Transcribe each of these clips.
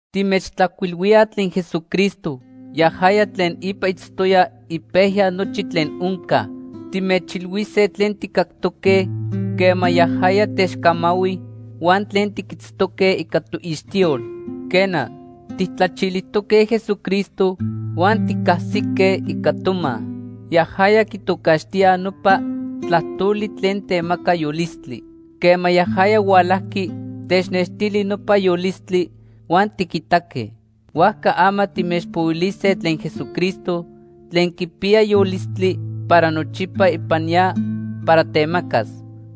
Timechtlajcuilhuilíaj tlen Jesucristo, yajaya tlen ipa itztoya ipejya nochi tlen onca. Timechilhuise tlen tijcactoque quema yajaya techcamahui huan tlen tiquitztoque ica toixtiyol. Quena, tijtlachilijtoque Jesucristo huan ticajsique ica toma. Yajaya quitocaxtíaj nopa “Tlajtoli” tlen temaca yolistli. Quema yajaya hualajqui, technextili nopa yolistli, huan tiquitaque. Huajca ama timechpohuilise tlen Jesucristo tlen quipiya yolistli para nochipa ipan ya para temacas.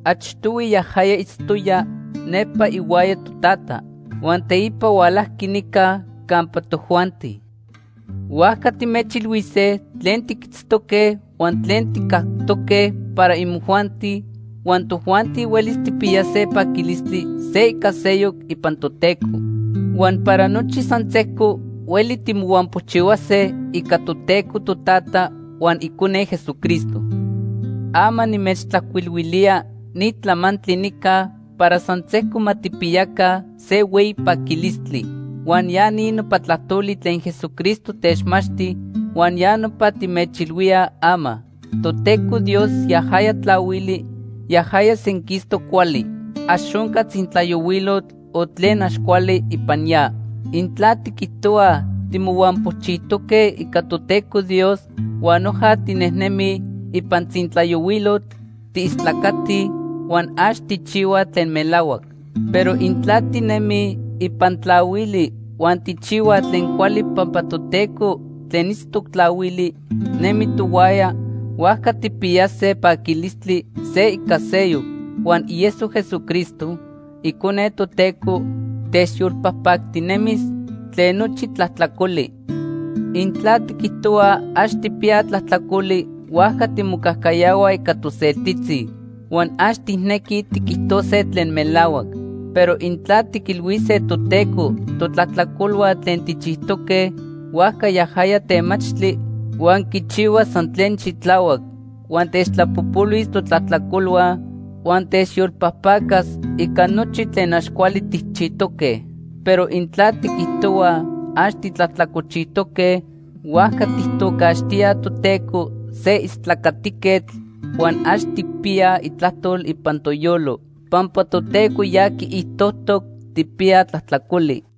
Achtohui yajaya itztoya nepa ihuaya Totata huan teipa hualajqui nica campa tojuanti. Huajca timechilhuise tlen tiquitztoque huan tlen tijcactoque para imojuanti huan tojuanti huelis tijpiyase paquilistli se ica seyoc ipan Toteco. Huan para nochi san sejco hueli timohuampochihuase ica Toteco Totata huan Icone Jesucristo. Ama nimechtlajcuilhuilía ni tlamantli nica para san sejco ma tijpiyaca se hueyi paquilistli. Huan ya ni nopa tlajtoli tlen Jesucristo techmachti huan ya nopa timechilhuíaj ama. Toteco Dios yajaya tlahuili, yajaya senquistoc cuali. Ax onca tzintlayohuilotl o tlen ax cuali ipan ya. Intla tiquijtohuaj timohuampochijtoque ica Toteco Dios huan noja tinejnemij ipan tzintlayohuilotl, tiistlacatij huan ax tijchihuaj tlen melahuac. Pero intla tinemij ipan tlahuili huan tijchihuaj tlen cuali pampa Toteco tlen itztoc tlahuili nemi tohuaya, huajca tijpiyase paquilistli se ica seyoc, huan ieso Jesucristo, Icone Toteco, techyolpajpactinemis tlen nochi tlajtlacoli. Intla tiquijtohuaj ax tijpiyaj tlajtlacoli, huajca timocajcayahuaj ica toseltitzi huan ax tijnequij tiquijtose tlen melahuac. Pero intla tiquilhuise Toteco totlajtlacolhua tlen tijchijtoque, huajca yajaya temachtli huan quichihua san tlen xitlahuac, huan techtlapojpolhuis totlajtlacolhua huan techyolpajpacas ica nochi tlen ax cuali tijchijtoque. Pero intla tiquijtohuaj ax titlajtlacolchijtoque, huajca tijtocaxtíaj Toteco se istlacatiquetl huan ax tijpiyaj itlajtol ipan toyolo pampa Toteco ya quiijtojtoc tijpiyaj tlajtlacoli.